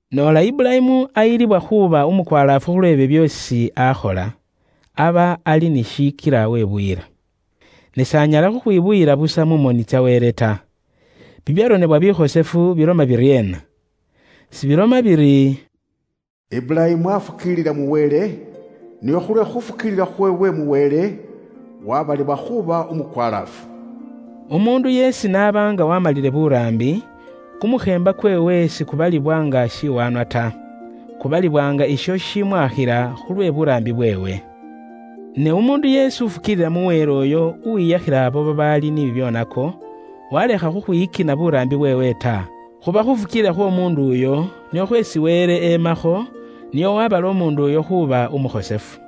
Noola Iburayimu ayilibwa khuuba umukwalaafu khulwe byo byeesi akhola, aba ali ni shishikila webuyila. Ne s'anyala khukhwibuyila busa mu moni tsa Wele ta. Bibyaronebwa bikhosefu biloma biryeena? Sibiloma biri, “Iburayimu aafukiilila mu Wele, nio khulwe khuufukiilila khweewe mu Wele, waabalibwa khuuba umukwalaafu.” Umuundu yeesi n'aba nga waamalile buraambi, kumukheemba kweewe sikubalibwa nga shiwaanwa ta. Kubalibwa nga isho shishimwaakhila khulwe buraambi bweewe. Ne umuundu yeesi ufukiilila mu Wele uyo uwiyakhila abo babaali ni bibyoonako, walekha khukhwiyikina buraambi bweewe ta, khuba khufukiilila khw'omuundu uyo nikhwo khweesi Wele emakho nio wabala umuundu uyo khuuba umukhosefu.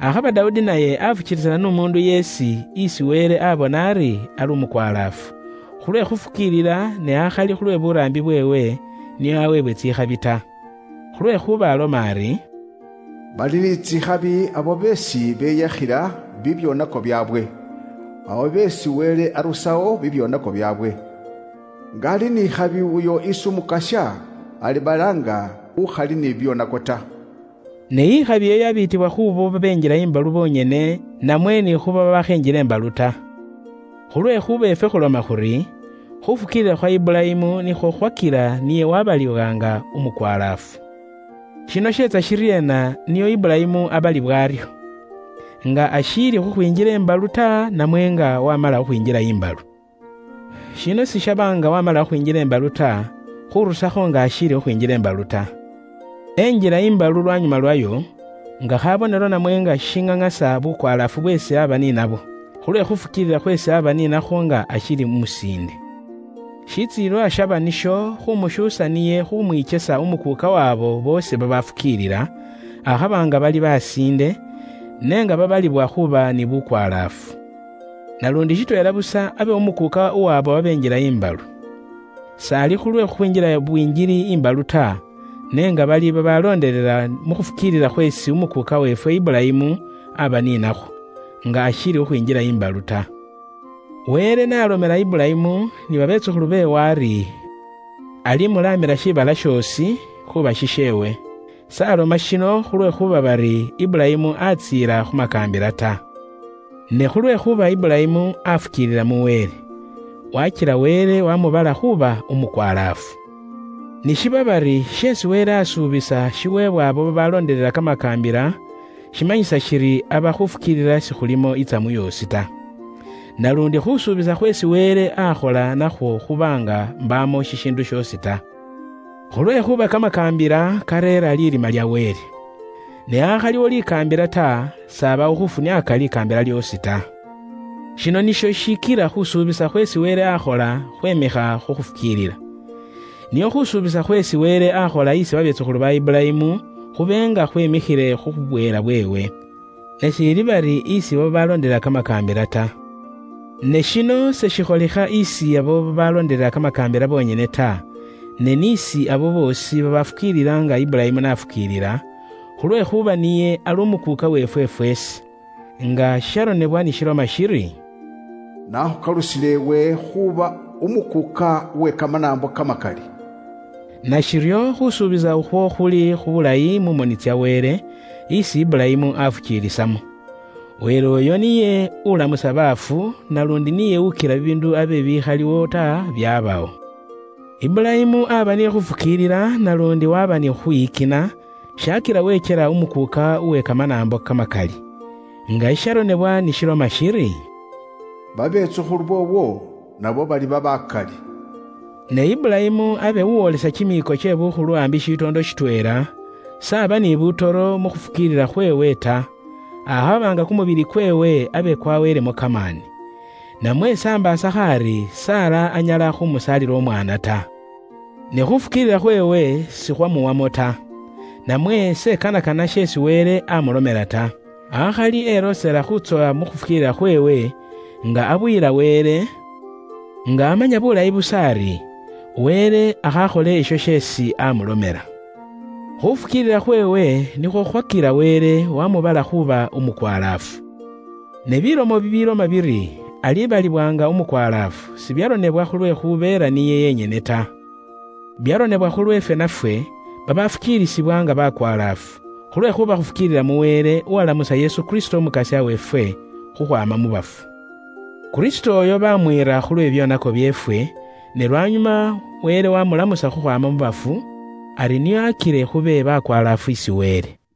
Akhaba Dawudi naye afukiilisana n'umuundu yeesi isi Wele abona ari ali umukwalaafu, khulwe khufukiilila ne akhali khulwe buraambi bweewe nio aweebwe tsikhabi ta. Khulwekhuuba aloma ari, “Bali ni tsikhabi abo beesi beyakhila bibyoonako byaabwe, abo beesi Wele arusawo bibyoonako byaabwe. Nga ali ni ikhabi uyo isi Umukasya alibala nga ukhali ni bibyoonako ta.” Ne ikhabi iyo yabiitibwa khu ba Isiraeli bonyene, namwe ni khu banaambo nabo? Khulwekhuuba ifwe khuloma khuri, khufukiilila khwa Iburayimu nikhwo khukhwakila niye wabaliwa nga umukwalaafu. Shino sheetsa shiryeena nio Iburayimu abaliwe aryo? Nga ashiili khukhwinjila imbalu ta, namwe nga wamala khukhwinjila imbalu? Shino sishaba nga wamala khukhwinjila imbalu ta, akhali nga ashiili khukhwinjila imbalu ta. Enjila imbalu lwanyuma lwayo, nga khabonelo namwe nga shishiŋaŋasa bukwalaafu bweesi aba ni nabwo, khulwe khufukiilila khweesi aba ni nakhwo nga ashiili umusiinde. Shitsilililwa shaba nisho khumushuusa niye khumwikesa umukuuka uw'abo boosi babafukiilila, akhaba nga bali basiinde, ne nga babalibwa khuuba ni bukwalaafu. Naluundi shitweela busa abe umukuuka uw'abo babenjila imbalu. S'ali khulwe khukhwinjila bwingili imbalu ta, ne nga bali babaloondelela mu khufukiilila khweesi umukuuka weefwe Iburayimu aba ni nakhwo, nga ashiili khukhwinjila imbalu ta. Wele n'alomela Iburayimu ni babetsukhulu beewe ari alimulaamila shiibala shoosi khuuba shisheewe, s'aloma shino khulwekhuuba bari Iburayimu atsiila khu makaambila ta. Ne khulwekhuuba Iburayimu afukiilila mu Wele. Wakila Wele wamubala khuuba umukwalaafu. Ni shiba bari sheesi Wele asuubisa shiweebwa abo babaloondelela kamakaambila, shimanyisa shiri aba khufukiilila sikhulimo itsamu yoosi ta. Naluundi khusuubisa khweesi Wele akhola nakhwo khuba nga mbaamo shishiindu shoosi ta. Khulwekhuuba kamakaambila kareera lirima lya Wele. Ne akhaliwo likaambila ta, s'abawo khufuniaaka likaambila lyoosi ta. Shino nisho shishikila khusuubisa khweesi Wele akhola khweemikha khu khufukiilila. Nio khusuubisa khweesi Wele akhola isi babetsukhulu ba Iburayimu khube nga khweemikhile khu bweela bweewe, ne akhali isi abo babaloondelela kamakaambila ta. Ne shino seshikholikha isi abo babaloondelela kamakaambila bonyene ta, ne ni isi abo boosi babafukiilila nga Iburayimu n'afukiilila, khulwekhuuba niye ali umukuuka uweefwe fweesi. Nga shisharonebwa ni shiloma shiri, “Naakhukalusile iwe khuuba umukuuka uwe kamanaambo kamakali.” Nashiryo khusuubisa ukhwo khuli khulayi mu moni tsya Wele, isi Iburayimu afukiilisamo. Wele uyo niye ulamusa baafu, naluundi niye ukila bibiindu abe bibikhaliwo ta, byabawo. Iburayimu aaba ni khufukiilila naluundi waba ni khukhwiyikina, shaakila wekyela umukuuka uwe kamanaambo kamakali. Nga shisharonebwa ni shiloma shiri, “Babetsukhulu boowo nabo baliba bakali.” Ne Iburayimu abe uwolesa kimiiko kye bukhulu ambi shitoondo shitweela, s'aba ni butoro mu khufukiilila khweewe ta, akhaba nga kumubili kweewe abe kwaweelemo kamaani. Namwe s'ambaasakho ari Sara anyala khumusaalila umwaana ta. Ne khufukiilila khweewe sikhwamuwamo ta, namwe s'ekanakana sheesi Wele amulomela ta. Akhali eloosela khutsowa mu khufukiilila khweewe, nga abuyila Wele, nga amanya bulayi busa ari, Wele akhaakhole isho sheesi amulomela. Khufukiilila khweewe nikhwo khukhwakila Wele wamubala khuuba umukwalaafu. Ne bilomo bibiiloma biri, “Alibaliwa nga umukwalaafu,” sibyaronebwa khulwekhubeela niye yenyene ta. Byaronebwa khulweefwe nafwe, babaalifukiilisibwa nga bakwalaafu, khulwekhuuba khufukiilila mu Wele, uwalamusa Yesu Kristo Umukasya weefwe, khukhwaama mu bafu. Kristo uyo bamwiira khulwe bibyoonako byeefwe, ne lwanyuma Wele wamulamusa khukhwaama mu bafu, ari nio akile khube bakwalaafu isi Wele.